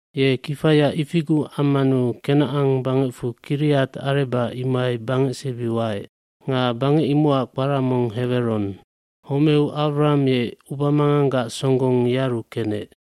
aKenacan bangecfu Kiriat Areba imohai bangecsebi waec. Nga bangec imocac kpara mong Heweron. Homeu Awraham ye ubamanganggac songgong yearu kenec.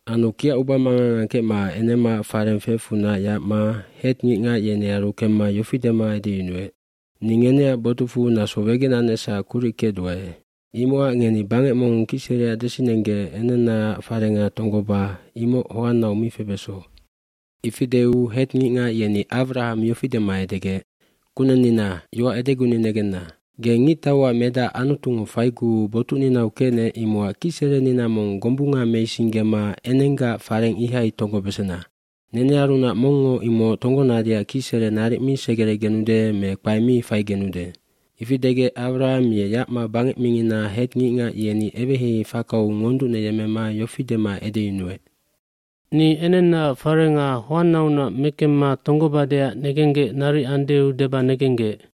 Ye kiac ubamangang angkecma enemaac fareng feecfunac yacma Het ngicngac yenearu kemma yofi dema edeyunuec, b“Ni ngeneac botucfu naso wegenanecsac kuric kecduae imocac ngeni bangec mong kicsereac desinenggec enennaac farenga tonggoba imoc hoannau mi febeso.” Ifi deu Het ngicngac yeni Awraham yofi dema edegec, “Kunennina, yoac edeguni negenna. Ge ngictauac medac Anutungo faiguu botucninau kecnec imocac kicserenina mong gombunga meisinggema enenggaac fareng ihai tonggobesena. Nenearunac mongngo imoc tonggonadeac kicsere naric mi segeregenude me kpae mi faigenude.” Ifi degec Awraham ye yacma bangec mingina Het ngicngac yeni eweheihei fakau ngonducneyemmema yofi dema edeyunuec, “Ni enennaac farenga hoannaunac mekemma tonggobadeac negenggec naric andeu deba negenggec.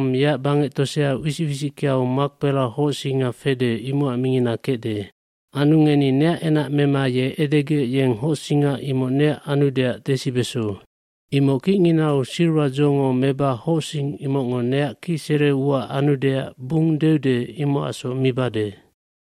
yeac bangec tosea wisic wisickeau Mahpela hocsinga fede imocac mingina kecde. Anu ngeni neac enac mema ye edegec yeng hocsinga imoc neac anudeac desibeso. Imoc kicnginau silwadzongo meba hocsing imocngo neac kicsere ua anudeac bung deude imocacsoc mibade.”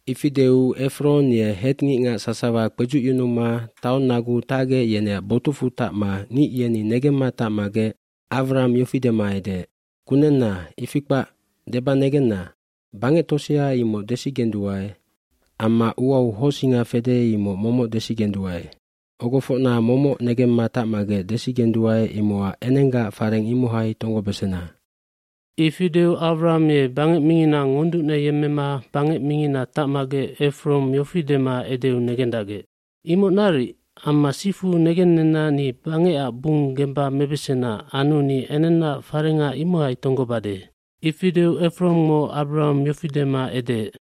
Ifi deu Efron ye Het ngicngac sasawa kpedzucyunuma taong naguu tacgec yeneac botucfu tacma ngic yeni negemma tacmagec Awraham yofi dema edeec, “Kunenna, ifi kpac, deba negenna. Bangectosea imoc desigenduae amma uau hocsinga fede imoc momoc desigenduae. Ogofocna momoc negemma tacmagec desigenduae imocac enenggaac fareng imohai tonggobesena.” Ifi deu Awraham ye bangec mingina ngonducneyemmema bangec mingina tacmagec Efron yofi dema edeu negendacgec, “Imoc naric, amma sifu negennenna ni bangecac bung gemba mebesena anu ni enennaac farenga imohai tonggobade.” Ifi deu Efrongngo Awraham yofi dema edeec,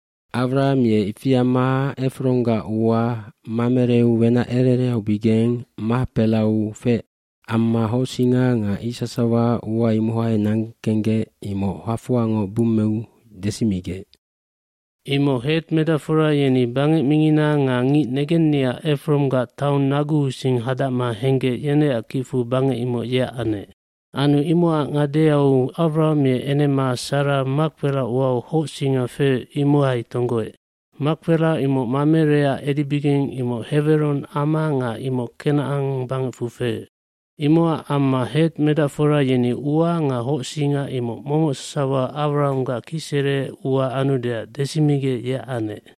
Awraham ye ifi amma Efronggac ua Mamereu wenac ere ereaubigeng Mahpelau feec amma hocsinga nga ic sasawa ua imohai nangkenggec imoc hafoangoc bummeu desimigec. dImoc Het medacfora yeni bangec mingina nga ngic negenniac Efronggac taong naguusing hadacma henggec yeneac kicfu bangec imoc yeac anec. eAnu imocac ngadeau Awraham ye enema Sara Mahpela uau hocsinga feec imohai tonggoec. Mahpela imoc Mamereac edibigeng imoc Heweron ama nga imoc Kenacan bangecfu feec. Imocac amma Het medacfora yeni ua nga hocsinga imoc momoc sasawa Awrahamgac kicsere ua anudeac desimigec yeac anec.